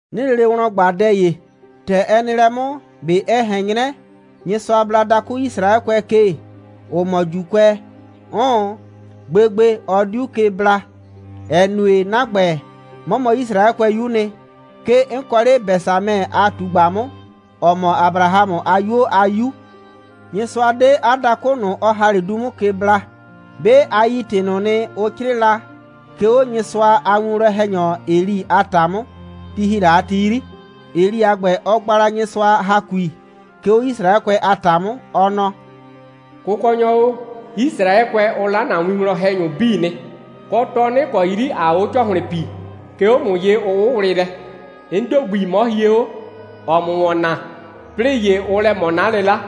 'Nɩɩ lele wlɔn ꞊gba dɛ ‑ye: ‑Tɛ ɛ nɩ lɛ 'mʋ, ꞊be ɛ ꞊hɛn 'nyrɛ, Nyɩsʋa bla 'a dakʋ Yisraɛkʋɛ ke, ‑ʋ mɔ ‑Juukʋɛ? 'Ʋʋn. Gbegbe, ɔ 'diu ke bla, ‑ɛ nue, 'na ‑gbɛ, 'mɔ mɔ Yisraɛkʋɛyu'u nɩ. 'Ke 'n kɔ 'le Bɛsamɛ a ꞊tugba 'mʋ, ‑ɔ mɔ Abrahamʋ a 'yuo a 'yu. Nyɩsʋa 'de 'a dakʋ ꞊nʋ, ɔ ‑ha 'le du 'mʋ ke bla. 'Be a yi ‑tɩ ꞊nʋ nɩ, ʋ 'crɩɩ la, 'ke 'o Nyɩsʋa a winwlɔn‑hɛnyɔ Eli a ‑ta 'mʋ ti ‑hi la a ti 'yri. Eli a ‑gbɛ, ɔ gba la Nyɩsʋa ‑hakui, 'ke 'o Yisraɛkʋɛ a ‑ta 'mʋ, ɔ nɔ: «Kʋkɔnyɔ o, Yisraɛkʋɛ, ʋ 'la ‑na winwlɔn‑hɛnyʋ 'bii nɩ, kɔ, tɔnɩ' ‑kɔ 'yri ‑aa o 'o ‑cɔhlɩn pii, 'ke 'o ‑mʋ ye, ʋ 'wʋwlɩ lɛ. 'N ‑do gbi, 'mɔ hie 'o, ‑ɔɔ ‑mʋ ‑wɔn naa, 'plɩɩ ‑ye ʋʋ lɛ ꞊mɔ 'na 'lɩla.»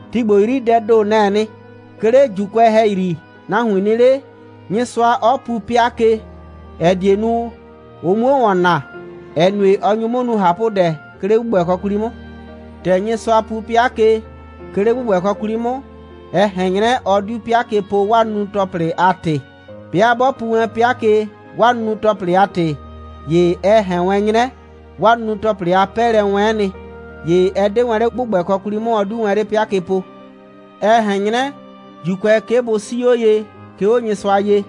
Ti ‑gbo 'yri, dɛɛ ‑do, nɛ‑ɛ nɩ. 'Ke 'le ‑Juukʋɛ ‑hɛyri, nahuin nɩ 'le, Nyɩsʋa 'ɔ pu 'pɩa ke, ‑ɛ die nu, ʋ 'muo ‑wɔn naa, ‑ɛ nue, ɔ nyu 'mʋ nu ꞊hapʋdɛ, 'ke 'le ‑gbʋgbɛkɔ 'kwli 'mʋ. ‑Tɛ Nyɩsʋa pu 'pɩa ke, 'ke 'le ‑gbʋgbɛkɔ 'kwli 'mʋ, ɛ ꞊hɛn 'nyrɛ, ɔ 'diu 'pɩa ke po, 'waa nunu‑tɔplɩ a ‑tɩ. 'Bɩa 'bɔ pu wɛn 'pɩa ke, 'waa nunu‑tɔplɩ a ‑tɩ, ‑ye ɛ ꞊hɛn wɛn 'nyrɛ, 'waa nunu‑tɔplɩ a 'pɛɛlɛ'ɛ wɛ'ɛn nɩ, ‑ye ɛ 'de wɛn 'le ‑gbʋgbɛkɔ 'kwli 'mʋ, ɔ 'diu wɛn 'le 'pɩa ke po. Ɛ ꞊hɛn 'nyrɛ, ‑Juukʋɛ, 'ke bʋ 'sii 'o ye, 'ke 'o Nyɩsʋa ye,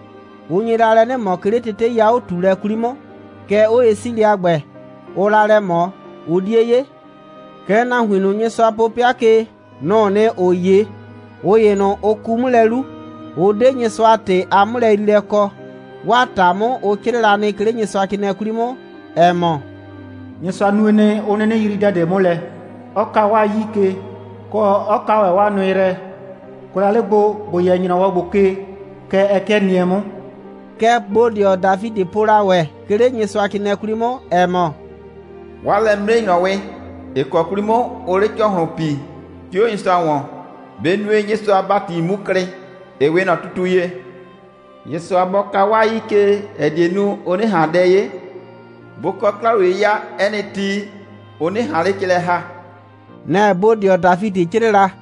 ʋ nye la lɛ 'nɩ ꞊mɔ, 'ke 'le tetei a 'o꞊tuulɛ 'kwli 'mʋ. Kɛɛ, 'oye'siilɛ a ‑gbɛ, ʋʋ la lɛ ꞊mɔ, ʋ 'die 'ye. Kɛɛ, nahuin ꞊nʋ, Nyɩsʋa po 'pɩa ke, nʋ‑ʋ nɩ, ‑ʋ 'ye. ꞊Ʋ ‑ye ꞊nʋ, ʋ ku 'mʋ lɛ 'lu, 'ʋ 'de Nyɩsʋa a ‑tɩ a 'mʋlɛyriilɛ kɔ. 'Waa ‑ta 'mʋ, ʋ 'crɩɛ la nɩ, 'ke 'le Nyɩsʋacrɩɩnɩɛ 'kwli 'mʋ, ‑ɛ mɔ: «Nyɩsʋa nue nɩ, 'ʋ 'nɩnɩ yrii dɛ ꞊de 'mʋ lɛ, 'ɔ ka 'waa 'yii ke, kɔ, 'ɔ ka ‑wɛ 'waa nʋɩ yrɛ. Kʋɛ la 'le gbo, ‑bo yɛ ‑nyrɔwɔ ‑gbo ke, kɛ ɛ 'kɩɛ nɩɛ 'mʋ.» Kɛ bodɩɔ Dafidɩ po la ‑wɛ, 'ke 'le Nyɩsʋacrɩɩnɩɛ 'kwli 'mʋ, ‑ɛ mɔ: «'Waa lɛ'mimre‑nyrɔwɩ, ‑ɩ kɔ 'kwli 'mʋ ʋʋ 'le ‑cɔhlʋn pii, 'ke 'o Nyɩsʋa ‑wɔn, bɩ nue, Nyɩsʋa a ‑bati 'mu klɩ, ‑ɩ 'we ꞊nɔ tutu ye. Nyɩsʋa bɔ ka 'waa 'yii ke, ‑ɛ die nu, ʋ 'nɩ ꞊han dɛ 'ye, bʋ kɔ 'kla‑wliye'yɩya 'ɛ nɩ ti, ʋ 'nɩ ꞊han 'le ke lɛ ‑ha.» Nɛ‑ bodɩɔ Dafidɩ 'crɩɩ la.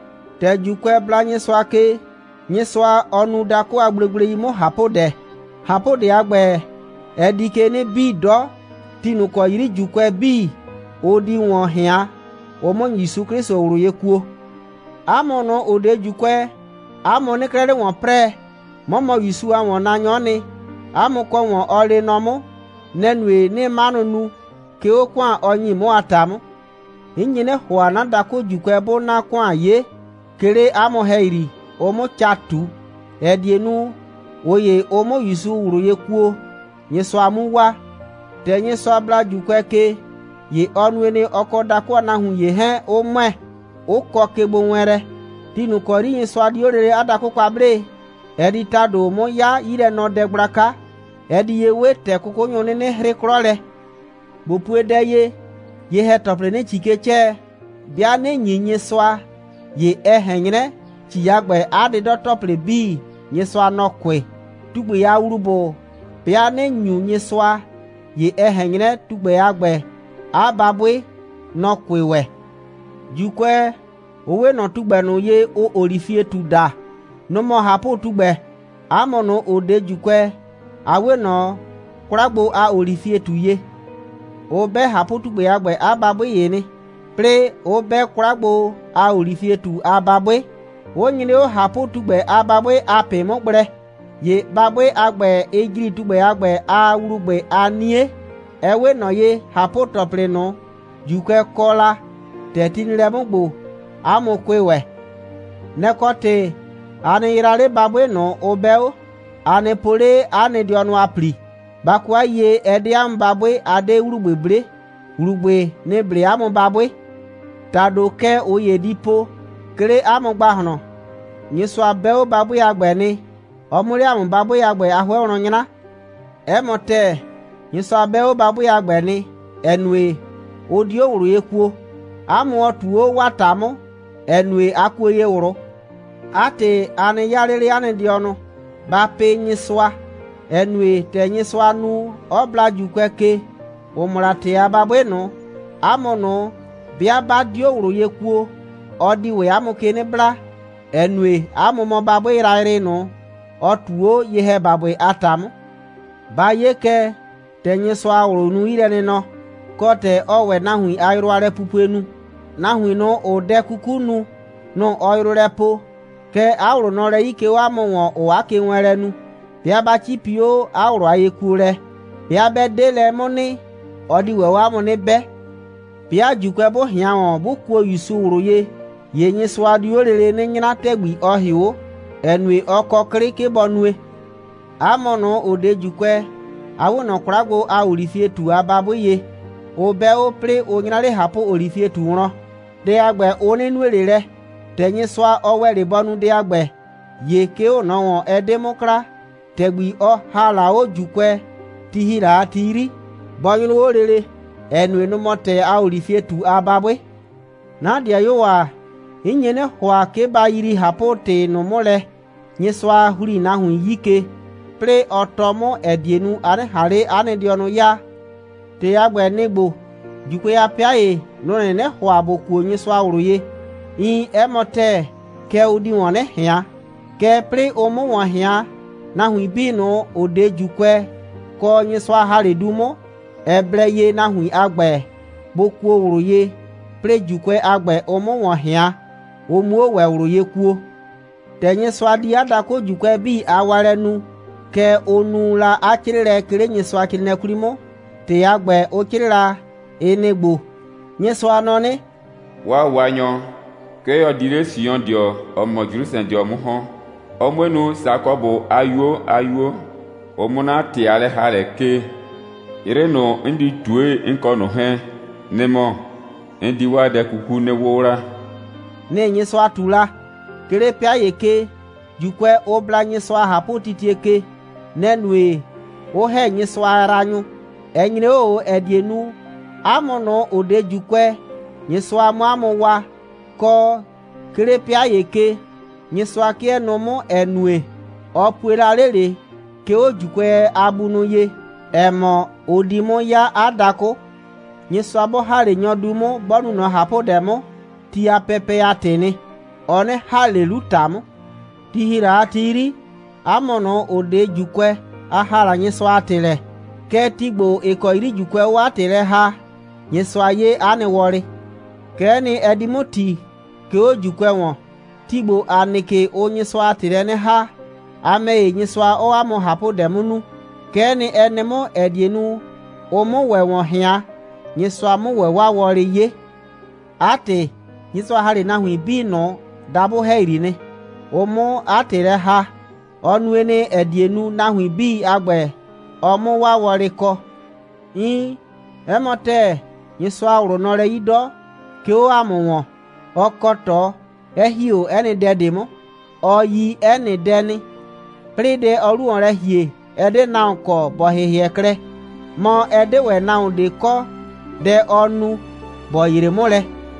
‑Tɛ ‑Juukʋɛ bla Nyɩsʋa ke, Nyɩsʋa, ɔ nu dakʋ a gblegblei 'mʋ ꞊hapʋdɛ. ꞊Hapʋdɛ a ‑gbɛ, ɛ di ke 'nɩ bii 'dɔ, ti ꞊nʋ ‑kɔ 'yri ‑Juukʋɛ 'bii, ʋ di ‑wɔn ꞊hɩan, ʋ 'mʋ ‑Yusu 'Klɩsʋ ꞊wlʋ ye kuo. 'A mʋ ꞊nʋ, ‑ʋ 'de ‑Juukʋɛ, 'a mʋ 'nɩɩ 'klɛɛ 'le ‑wɔn 'prɛɛ. 'Mɔ mɔ ‑Yusu a ‑wɔnnaanyɔ'ɔ nɩ, 'a mʋ kɔ ‑wɔn, ɔ lee nɔ 'mʋ. Nɛ‑ nue, 'nɩɩ 'manʋ nu, 'ke 'o ‑kʋan, ɔ ‑nyi 'mʋ a ‑ta 'mʋ. 'N nye 'nɩ ‑hʋa, 'na dakʋ ‑Juukʋɛ 'bʋʋ 'na ‑kʋan 'ye, 'ke 'le 'a mʋ ‑hɛyri, ʋ 'mʋ ca ꞊tu, ‑ɛ die nu, ꞊ʋ ‑ye, ʋ 'mʋ ‑Yusu ꞊wlʋ ye kuo, Nyɩsʋa 'mu waa. ‑Tɛ Nyɩsʋa bla ‑Juukʋɛ ke, ‑ye ɔ nue nɩ, ɔ kɔ dakʋ a nahuin ‑ye 'hɛɛn 'ʋ ‑mʋɛ, 'ʋ kɔ kegbowɛɛnlɛ. Ti ꞊nʋ ‑kɔ 'yri Nyɩsʋa di 'o lele 'a dakʋ kwa 'blee, ɛ di ‑tado 'mʋ 'ya 'yilɛnɔdɛ gblaka. Ɛ di ye 'we ‑tɛ 'kʋkʋnyʋ 'nɩnɩ 'hrɩ 'klɔ lɛ. ꞊Bo pue dɛ ye. Ye‑hɛ‑tɔplɩ, ‑nɩɩ ‑ci ke 'cɛɛ, 'bɩa ꞊nɩ ‑nyi Nyɩsʋa, ‑ye ɛ ꞊hɛn 'nyrɛ, ‑ci a ‑gbɛ a 'dɩdɔ‑tɔplɩ 'bii, Nyɩsʋa, nɔ‑ kʋɩ. Tugbɛ a ‑wlubʋ, 'bɩa ꞊nɩ ‑nyu Nyɩsʋa, ‑ye ɛ ꞊hɛn 'nyrɛ, tugbɛ a ‑gbɛ a babʋɩ, nɔ‑ kʋɩ ‑wɛ. ‑Juukʋɛ, ʋ 'we ꞊nɔ tugbɛ ꞊nʋ ye, ʋʋ olifietu daa. Nʋ‑ mɔ ꞊hapʋtugbɛ. 'A mʋ ꞊nʋ, ‑ʋ 'de ‑Juukʋɛ, a 'we ꞊nɔ 'kwla gbo a olifietu ye. Ʋ 'bɛ ꞊hapʋtugbɛ a ‑gbɛ a babʋɩ ‑ye nɩ, 'plɩɩ 'ʋ 'bɛ 'kwla gbo a olifietu a babʋɩ, 'ʋ 'nyrɩ 'o ꞊hapʋtugbɛ a babʋɩ a ꞊pɩ 'mʋ gblɛ. ‑Ye babʋɩ a ‑gbɛ, ɩɩ ‑jri tugbɛ a ‑gbɛ a ‑wlubʋɩ a 'nie. Ɛ 'we ꞊nɔ ye, ꞊hapʋ‑tɔplɩ ꞊nʋ, ‑Juukʋɛ kɔ la, ‑tɛ ti nɩ lɛ 'mʋ ‑gbo, 'a mʋ kʋɩ ‑wɛ. Nɛ‑ kɔ ‑tɩ, a nɩ yraa 'le babʋɩ ꞊nʋ, ʋ 'bɛ 'o. A nɩ po 'le 'a nɩ dɩɔnʋ a ‑pli. Ba kɔ 'a yiyie, ɛ 'de 'a mʋ babʋɩ, a 'de ‑wlubʋɩ 'ble, ‑wlubʋɩ, nɩ‑ 'ble 'a mʋ babʋɩ. ‑Tado kɛ ꞊ʋ ‑ye di po, 'ke 'le 'a mʋ ‑gbahlɔn: «Nyɩsʋa 'bɛ 'o babʋɩ a ‑gbɛ nɩ, ɔ 'mʋ 'le ‑a mʋ babʋɩ a ‑gbɛ a 'hʋɛ wlɔn 'nyra.» 'Ɛ mɔ ‑tɛɛ. Nyɩsʋa 'bɛ 'o babʋɩ a ‑gbɛ nɩ, ‑ɛ nue, ʋ 'dio ꞊wlʋ ye kuo. 'A mʋ ɔ ꞊tu 'o 'waa ‑ta 'mʋ, ‑ɛ nue, a kuo ye ꞊wlʋ. 'A ‑tɩ, a nɩ 'yaa 'le 'le 'a nɩ dɩɔnʋ, ba pɩ Nyɩsʋa, ‑ɛ nue, ‑tɛ Nyɩsʋa nu, 'ɔ bla ‑Juukʋɛ ke, ‑ʋ mɔ la ‑tɛɛ a babʋɩ ꞊nʋ, 'a mʋ ꞊nʋ, 'bɩa 'ba 'dio ꞊wlʋ ye kuo, ɔ di ‑wɛ 'a mʋ ke 'nɩ bla, ‑ɛ nue, 'a mʋ mɔ babʋɩ yrayrɩ ꞊nʋ, ɔ ꞊tu 'o ye‑hɛbabʋɩ a ‑ta 'mʋ. Ba 'ye kɛ, ‑tɛ Nyɩsʋa a ꞊wlʋ nu 'yilɛnɩnɔ, kɔ, ‑tɛ ɔɔ ‑wɛ nahuin a yrʋ a lɛpupue nu. Nahuin ꞊nʋ, ‑ʋʋ dɛ 'kuku nu, nʋ‑ ɔɔ yrʋ lɛ poo. Kɛɛ, 'a ꞊wlʋ nɔ lɛ 'yi, 'ke 'o 'a mʋ ‑wɔn, ‑ʋʋ 'a kewɛɛnlɛ nu, 'bɩa 'ba 'cipi 'o 'a ꞊wlʋ a yekuolɛ. 'Bɩa 'bɛ 'de lɛ 'mʋ nɩ, ɔ di ‑wɛ 'o 'a mʋ 'nɩ 'bɛ. 'Bɩa ‑Juukʋɛ, 'bʋ ꞊hɩan ‑wɔn, 'bʋ kuo ‑Yusu ꞊wlʋ ye, ‑ye Nyɩsʋa diu 'o lele 'nɩ 'nyra ‑tɛgbi, ɔ ‑hɩʋ 'o, ‑ɛ nue, ɔ kɔ 'klɩ, 'ke bɔ nue. 'A mʋ ꞊nʋ, ‑ʋ 'de ‑Juukʋɛ, a 'we ꞊nɔ 'kwla gbo a olifietu a babʋɩ ye, ʋ 'bɛ 'o, 'plɩɩ ʋ 'nyra 'le ꞊hapʋolifietu wlɔn. Dɛ a ‑gbɛ, ʋ 'nɩ nue ꞊le lɛ. ‑Tɛ Nyɩsʋa, ɔ ‑wɛ 'le bɔ nu dɛ a ‑gbɛ, ‑ye 'ke 'o ꞊nɔ ‑wɔn, ɛ 'de 'mʋ kla, ‑tɛgbi ɔ ‑ha la 'o ‑Juukʋɛ, ti ‑hi la a ti 'yri, bɔ 'nyrʋ 'o lele, ‑ɛ nue, nʋ‑ mɔ ‑tɛɛ a olifietu a babʋɩ. 'Na 'dɩayuo ‑a, 'n nye 'nɩ ‑hʋa, 'ke ba yrii ꞊hapʋ‑tɩ ꞊nʋ 'mʋ lɛ, Nyɩsʋa ‑hli nahuin 'yi ke, 'plɩɩ ɔ tɔɔ 'mʋ, ‑ɛ die nu, a 'nɩ ꞊han 'le 'a nɩ dɩɔnʋ 'yaa. ‑Tɩ a ‑gbɛ, nɩ‑ ‑gbo: ‑Juukʋɛ, 'a 'pɩa ‑ye, nʋ‑ 'nɩnɩ ‑hʋa ‑bʋ kuo Nyɩsʋa ꞊wlʋ ye. Iin, 'ɛ mɔ ‑tɛɛ, kɛɛ, ʋ di ‑wɔn 'nɩ ꞊hɩan. Kɛɛ, 'plɩɩ ʋ 'mʋ ‑wɔn ꞊hɩan, nahuin 'bii ꞊nʋ, ‑ʋ 'de ‑Juukʋɛ, kɔ, Nyɩsʋa ‑ha 'le du 'mʋ, ɛ blɛ ye, nahuin a ‑gbɛ bʋ kuo ꞊wlʋ ye, 'plɩɩ ‑Juukʋɛ a ‑gbɛ, ʋ 'mʋ ‑wɔn ꞊hɩan, ʋ 'muo ‑wɛ ꞊wlʋ ye kuo. ‑Tɛ Nyɩsʋa di 'a dakʋ ‑Juukʋɛ 'bii a waalɛ nu, kɛ ʋ nu la 'a 'crɩɩlɛ, 'ke 'le Nyɩsʋacrɩɩnɩɛ 'kwli 'mʋ. ‑Tɩ a ‑gbɛ, ʋ 'crɩɩ la, ɩ nɩ‑ ‑gbo: «Nyɩsʋa nɔ 'nɩ: 'Waa Waanyɔ, 'ke ɔ di 'le Siondɩɔ, ‑ɔ mɔ Jrusrɛdɩɔ 'mʋ ‑hɔn, ɔ 'mue nu, Sakɔbʋ a 'yuo a 'yuo, ʋ 'mʋ 'na ‑tɩ a lɛ‑haalɛ 'kee. 'Yrɩ ꞊nʋ, 'n di ꞊tue, 'n kɔ ꞊nʋ 'hɛɛn, nɩ‑ mɔ: 'n di 'waa dɛ 'kuku 'nɩ 'wʋwla.» Nɩ‑ Nyɩsʋa ꞊tu la. 'Ke 'le 'pɩa ‑ye ke, ‑Juukʋɛ, ʋ bla Nyɩsʋa a ꞊hapʋtitie ke. Nɛ‑ nue, 'ʋ ‑hɛ Nyɩsʋa a yraanyʋ. Ɛ nyre 'o ꞊o, ‑ɛ die nu, 'a mʋ ꞊nʋ, ‑ʋ 'de ‑Juukʋɛ, Nyɩsʋa 'mʋ 'a mʋ waa. Kɔ, 'ke 'le 'pɩa ‑ye ke, Nyɩsʋa 'kɩɛ nʋʋ 'mʋ, ‑ɛ nue, ɔ pue la 'le ꞊le, 'ke 'o ‑Juukʋɛ a bunʋ ye, ‑ɛ mɔ, ʋ di 'mʋ 'ya 'a dakʋ. Nyɩsʋa 'bɔ ‑ha 'le nyɔ du 'mʋ, 'bɔ nu ꞊nɔ ꞊hapʋdɛ 'mʋ, ti a pɛpɛ a ‑tɩɩ nɩ. Ɔ 'nɩ ‑ha ꞊le 'lu ‑ta 'mʋ. Ti ‑hi la a ti 'yri, 'a mʋ ꞊nʋ, ‑ʋ 'de ‑Juukʋɛ, a ‑haa la Nyɩsʋa a ‑tɩ lɛ. Kɛɛ, ti ‑gbo, ‑ɩ kɔ 'yri ‑Juukʋɛ, ʋʋ 'o 'a ‑tɩ lɛ ‑haa, Nyɩsʋa 'ye 'a nɩ wɔlɩ. Kɛ'ɛ nɩ, ɛ di 'mʋ ‑ti, 'ke 'o ‑Juukʋɛ ‑wɔn. Ti ‑gbo, ‑a nɩ ke, ʋʋ Nyɩsʋa a ‑tɩ lɛ 'nɩ ‑haa, a ‑mɛ ‑ye, Nyɩsʋa 'ɔɔ 'a mʋ ꞊hapʋdɛ 'mʋ nu. Kɛ'ɛ nɩ, ɛ nɩ 'mʋ, ‑ɛ die nu, ʋ 'mʋ ‑wɛ ‑wɔn ꞊hɩan, Nyɩsʋa 'mʋ ‑wɛ 'waa wɔlɩ 'ye. 'A ‑tɩ, Nyɩsʋa ‑ha 'le nahuin 'bii ꞊nʋ dabʋ ‑hɛyri nɩ, ʋ 'mʋ 'a ‑tɩ lɛ ‑haa. Ɔ nue nɩ, ‑ɛ die nu, nahuin 'bii a ‑gbɛ, ɔ 'mʋ 'waa wɔlɩ kɔ. Iin, 'ɛ mɔ ‑tɛɛ, Nyɩsʋa a ꞊wlʋ nɔ lɛ 'yi 'dɔ, 'ke 'o ‑a mʋ ‑wɔn. Ɔ kɔ ꞊tɔ, 'ɛ ‑hi 'o 'ɛ nɩ dɛ ꞊de 'mʋ. Ɔ yi 'ɛ nɩ dɛ nɩ. 'Plɩɩ, dɛ, ɔɔ 'lu ‑wɔn lɛ ‑hie, ɛ 'de nahuon kɔ, ‑bɔ ‑hɩhɩɛ klɛ. Mɔ, ɛ 'de ‑wɛ nahuon ꞊de kɔ, dɛ ɔɔ nu, ‑bɔ yree 'mʋ lɛ.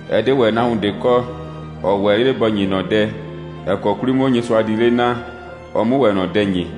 Ɛ 'de ‑wɛ nahuon ꞊de kɔ, ‑ɔ ‑wɛ 'le ‑bɔ ‑nyi ꞊nɔ dɛ, ‑ɛ kɔ 'kwli 'mʋ Nyɩsʋa di 'le naa, ɔ 'mʋ ‑wɛ ꞊nɔ dɛ ‑nyi.»